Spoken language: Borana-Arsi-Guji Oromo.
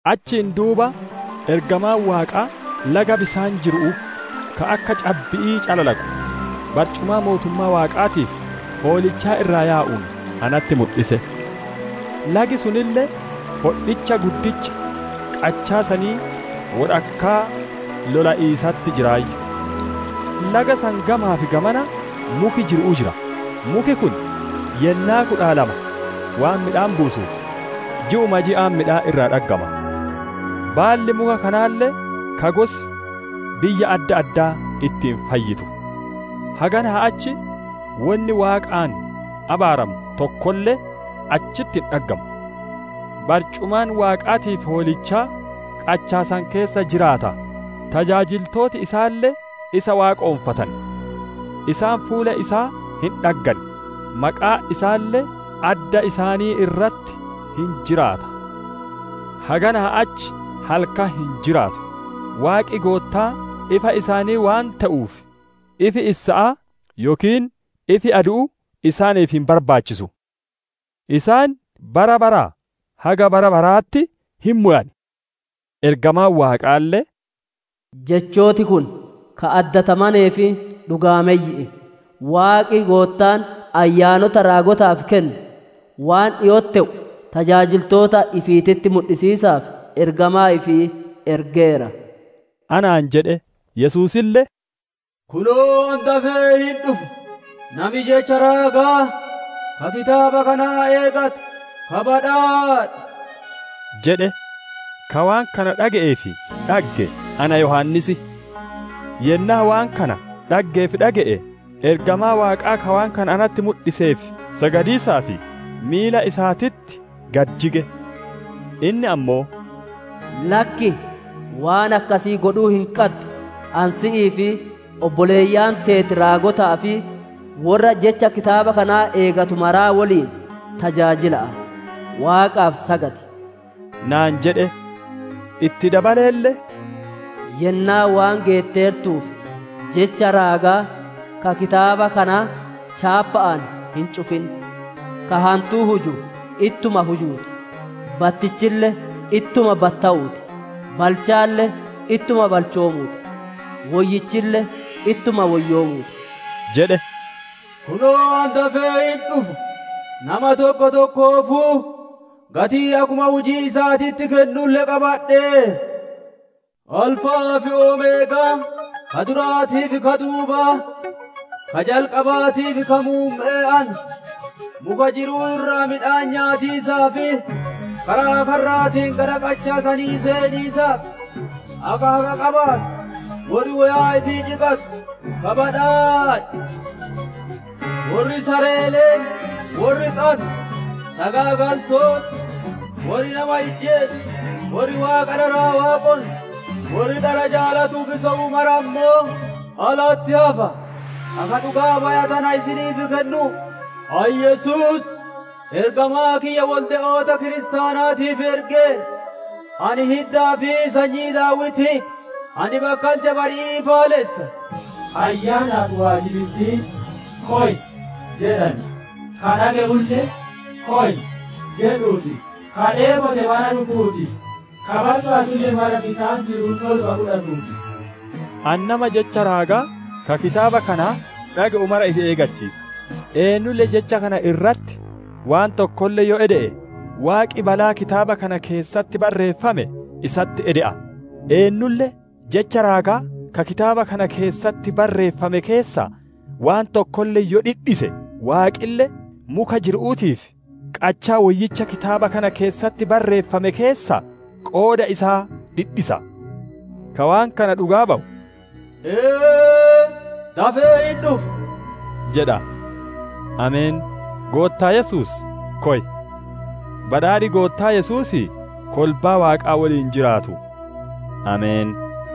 Achiin duuba ergamaan Waaqaa laga bisaan jiru'uu, ka akka cabbi'ii calalaqu, barcumaa mootummaa Waaqaatii fi Hoolichaa irraa yaa'uun natti mudhise. Lagi sunille hodhicha guddicha qachaa sanii wodhakkaa lola'iisatti jiraayyu. Laga san gamaa fi gamana muki jiru'uu jira; muki kun wogga'atti yennaa kudha lama waan midhaan buusuuf, ji'uma ji'aan midhaan irraa dhaggama. Baalli muka kanaalle ka gosi biyya adda addaa ittiin fayyitu. Haganaa achi wonni Waaqaan abaaramu tokkolle achitti hin dhaggamu. Barcumaan Waaqaatii fi Hoolichaa qachaa san keessa jiraata; tajaajiltooti isaalle isa waaqonfatan. Isaan fuula isaa hin dhaggan, maqaan isaalle adda isaanii irratti hin jiraata. Haganaa achi halkan hin jiraatu; Waaqi Goottaan ifa isaanii waan te'uuf, ifi issa'aa, yookiin ifi adu'uu isaaniif hin barbaachisu. Isaan bara baraa haga bara baraatitti hin mowan. Ergamaan Waaqaalle, «Jechooti kun ka addatamanee fi dhugaammeyyi'i. Waaqi Goottaan Ayyaanota raagotaaf kennu, waan dhiko'otti te'u, tajaajiltoota ifiititti mudhisiisaaf, ergamaa ifii ergeera» anaan jedhe. Yesuusille, «Kunoo, ani dafee hin dhufa; nami jecha raagaa, ka kitaaba kanaa eeggatu, ka badhaadhe» jedhe. Ka waan kana dhage'ee fi dhagge, ana Yohaannis. Yennaa waan kana dhaggee fi dhage'e, ergamaa Waaqaa ka waan kana natti mudhiseef sagadiisaaf, miila isaatitti gadi jige. Inni ammoo, «Lakkii! Waan akkasii godhuu hin qaddu! Ani si'ii fi obboleeyyan teeti raagotaa fi worra jecha Kitaaba kanaa eeggatu maraa woliin tajaajila'a; Waaqaaf sagadi» naan jedhe. Itti dabaleelle, «Yennaan waan geetteertuuf, jecha raagaa, ka Kitaaba kanaa chaappa'aan hin cufin. Ka hantuu huju, ittuma hujuu ti; battichille ittuma battowuu ti; balchaalle ittuma balchoomuu ti; woyyichille ittuma woyyoomuu ti» jedhe. «Kunoo, ani dafee hin dhufa! Nama tokko tokkoofuu gatii akkuma hujii isaatitti kennulle qabadheera. Alfa'aa fi Omeegaan, ka duraatii fi ka duubaa, ka jalqabaatii fi ka muumme'ee ana.» Muka jiru'uu irraa midhaan nyaatiisaa fi karaa karraatiin gara qachaa sanii seeniisaaf, akka haqa qabaatu, worri woyaa ifii dhiqatu ka badhaadhe. Worri sareeleen, worri xanu, sagaagaltooti, worri nama ijjeesu, worri waaqa dharaa waaqonsu, worri dhara jaalatuu fi sobu mara ammoo alatti hafa. «Akka dhugaa baya tana isiniif kennuuf, ani Yesuus ergamaa kiyya wolde'oota kiristaanaatiif ergeera; ani hiddaa fi sanyii Daawitii ti; ani bakkalcha bari'ii ifaalessa.» Ayyaanaa fi waajibittiin, «Koy» jedhan; ka dhage'ulle, «Koy» jedhuu ti; ka dheebote mara dhufuu ti; ka barbaadulle mara bisaan jiru'uu toluma fudhatuu ti. Ani nama jecha raagaa, ka Kitaaba kanaa dhage'u mara ifi eeggachiisa; eennulle jecha kana irratti waan tokkolle yoo ede'e, Waaqi balaa Kitaaba kana keessatti barreeffame isatti ede'a; eennulle jecha raagaa ka Kitaaba kana keessatti bareeffame keessaa waan tokkolle yoo dhidhise, Waaqille muka jiru'uutii fi qachaa woyyicha kitaaba kana keessatti barreeffamane keessaa qooda isaa dhidhisa. Ka waan kana dhugaa bawu, «Ee, dafee hin dhufa» jedha. Ameen! Goottaa Yesuus, koy. Badhaadhi Goottaa Yesuusii, kolbaa Waaqaa woliin jiraatu. Ameen!